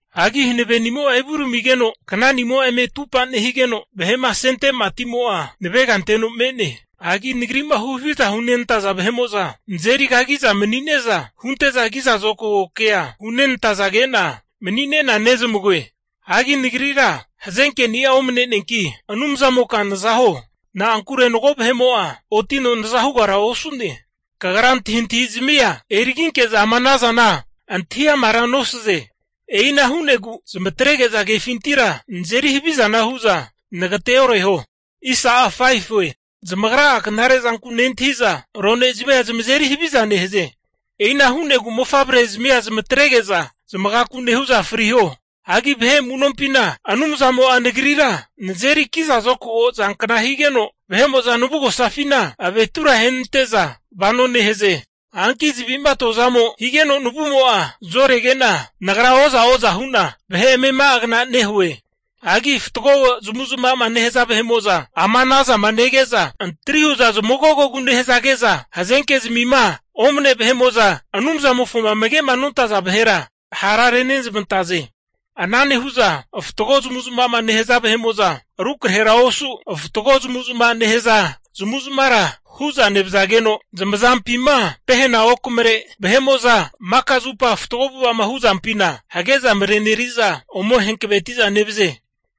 Hagi hanavenimo'a evuramigeno, knani'amo'a eme upa nehigeno, vahe'ma asente matimo'a navega anteno me'ne. Hagi nagri'ma huhaviza hunenantaza vahe'mo'za nazeri kagi'za mani'ne'za, hunte'za ki'za zokago kea hunenantazage'na mani'ne'na nezmagoe. Hagi nagrira hazenkeni'a omneneanki, Anumzamoka naza huo. Na'ankure mago vahe'mo'a otino naza hugara osu'ne. Kagra antahintahizmia eriginke'za ama ana zana antahi amara nosaze. E'ina hu'negu zamatrege'za kefintira nazeri havizana hu'za nagateoreho. Zamagra'a knare zanku nentahi'za, aronezmia zamazeri haviza nehaze. E'ina hu'negu mofavrezimia zamatrege'za, zamagaku nehu'za friho. Hagi vahe amu'nompina Anumzamo'a nagrira nazeri kizazokago zankna higeno, vahe'mo'za navugosafina zamavetura ahenante'za vano nehaze. Hanki zavi'ma atoa zamo higeno navumo'a zorege'na, nagra oza'oza hu'na vahe amema'agna nehue. Hagi fatgo zamavu'zmava'ma nehaza vahe'mo'za ama anazama nege'za, antri hu'za zamagogogu nehazage'za, hazenke'zmima omne vahe'mo'za Anumzamofoma amage'ma nontaza vahera ha' renezmantaze. Ana nehu'za fatgo zamavu'zma'ma nehaza vahe'mo'za rukrahera osu, fatgo zamavu'zmavama nehaza vahe'mo'za zamavu'zmavara hu'za nevazageno, zamazampima pehena okamare maka zupa fatgo avu'ava'ma hu'zampina hage'za mareneri'za ome hankaveti'za nevaze.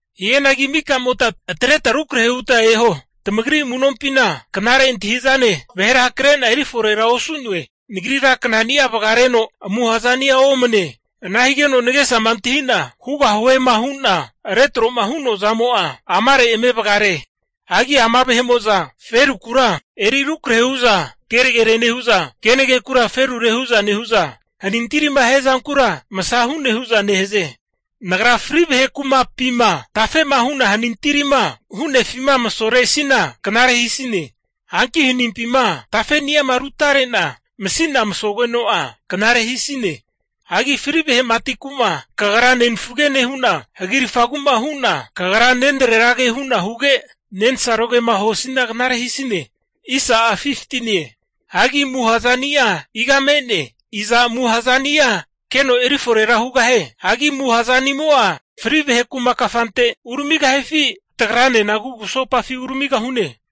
Hianagi mika'mota atreta rukrahe huta eho, tamagri amu'nompina knare antahi'zane vahera hakre'na eri forera osu'noe. Nagrira knani'a vagaregeno amuha zani'a omane. Ana higeno nagesama antahi'na hugahuema hu'na retroma hu'noa zamo'a amare eme vagare. Hagi ama vahe'mo'za ferukura eri rukrahe hu'za kenagere nehu'za, kenagekura ferure hu'za nehu'za, hanintirima hiazankura masa hu'ne hu'za nehaze. Nagra fri vahe kumapima tafe'ma hu'na hanintirima hu'nefima masoresina knare hisine. Hanki hanimpima tafeni'ama rutare'na masina masogeno'a, knare hisine. Hagi fri vahe matiku'ma hu'na kagra nenfage nehu'na, hagirafagu'ma hu'na, kagra nenrerage hu'na huge, nensarogema huasina knare hisine. Hagi amuha zani'a iga me'ne? Iza amuha zani'a hakeno eri fore hugahie. Hagi amuha zanimo'a fri vahe kuma kafante uramigahifi? Tagranena kugusopafi uramigahuno?